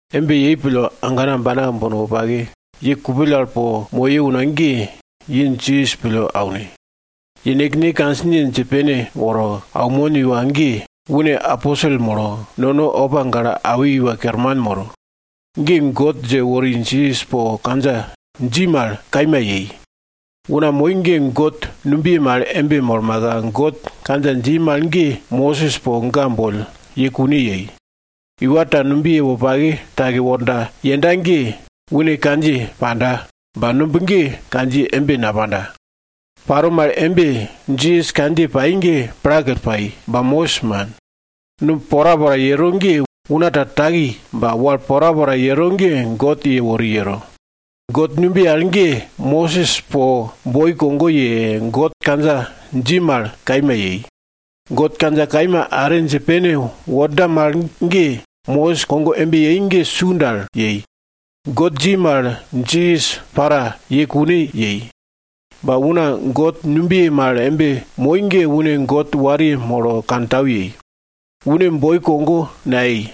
Embe yei pille, agana ambana wopake, ye kupill al po moye una ge, ye Jisas pille aune. Yene kandjiye dje pene woro aunmon iwa ge, une aposel molo, nono opa gale awi iwa kerman moro. Ge God dje wori Jisas po kandja dji mal kaima yei. Una moi ge God numbiye mal embe molmaka God kandja dji mal ge Mosis po ga boll ye kune yei. Iwa ta numbiye wopake take worda yenda ge, une kandjiye panda, ba numb ge kandjiye embe napanda. Paro mal embe, Jisas kandjiye pai ge plakill pai, ba Mosis man. Numb porapora yero ge una ta taki ba wal porapora yero ge God yewori yero. God numbiye al ge, Mosis po boi kogo ye, God kandja dji mal kaima yei. God kandja kaima are dje pene worda mal ge, Mosis kogo embe yei ge su dal yei. God dji mal Jisas para ye kune yei, ba una God numbiye mal embe moi ge une God wariye molo kantau yei. Une boi kogo nayei.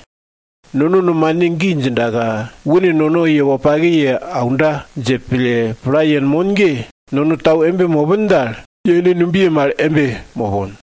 Nono nomane gi djindaka, une nono ye wopake ye aunda dje pille pla yenmon ge, nono tau embe mopin dal, yene numbiye mal embe mopon.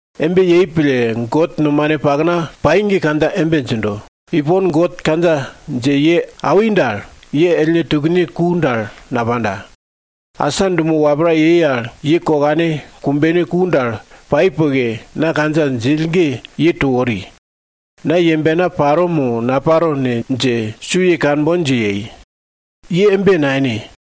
Embe yei pille, God Murble pai ge kandja embe djindo, Ipon, God kandja dje ye awi dal, ye ellne tukne ku dal napanda. Asa dumo wapra yei al, ye kokane kumbene ku dal pai poke, na kandja djill ge ye to wori. Na yembena paro mo naparo ne dje su ye kanbon dje yei. Ye embe nayene.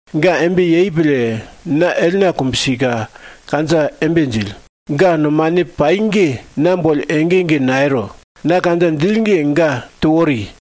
Ga embe yei pille, na ellna kumbsika kandja embe djill, ga nomane pai ge, na boll ege ege nayero, na kandja djill ge, ga to wori.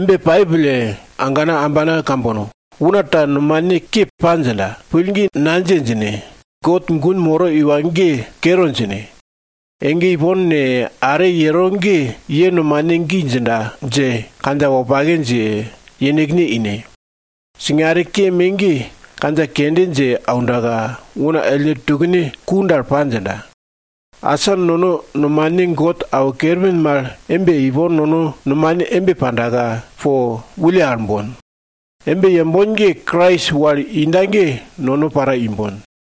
Embe pai pille, agana ambana kambono, una ta nomane ke pa djinda, pillgi nadje djine, God gun moro iwa ge kere djine. Ege ipon ne, are yero ge, ye nomane gi djinda dje kandja wopake dje yenekne ine. Singare ke me ge kandja kende dje aundaka, una ellne tukne ku dal pa djinda. Asa nono nomane God awo kerpin mal embe, ipon nono nomane embe pandaka po wulle al bon. Embe yembon ge, Krais wal inda ge nono para imbon.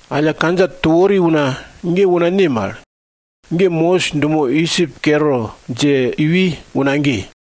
Alla, kandja to wori una ge una ne mal? Mosis dumo Idjip kere dje iwi una ge.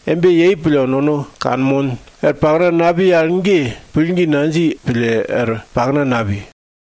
Embe yei pille nono kanmon, er pakna napi al ge, pillgi nadji pille er pakna napi.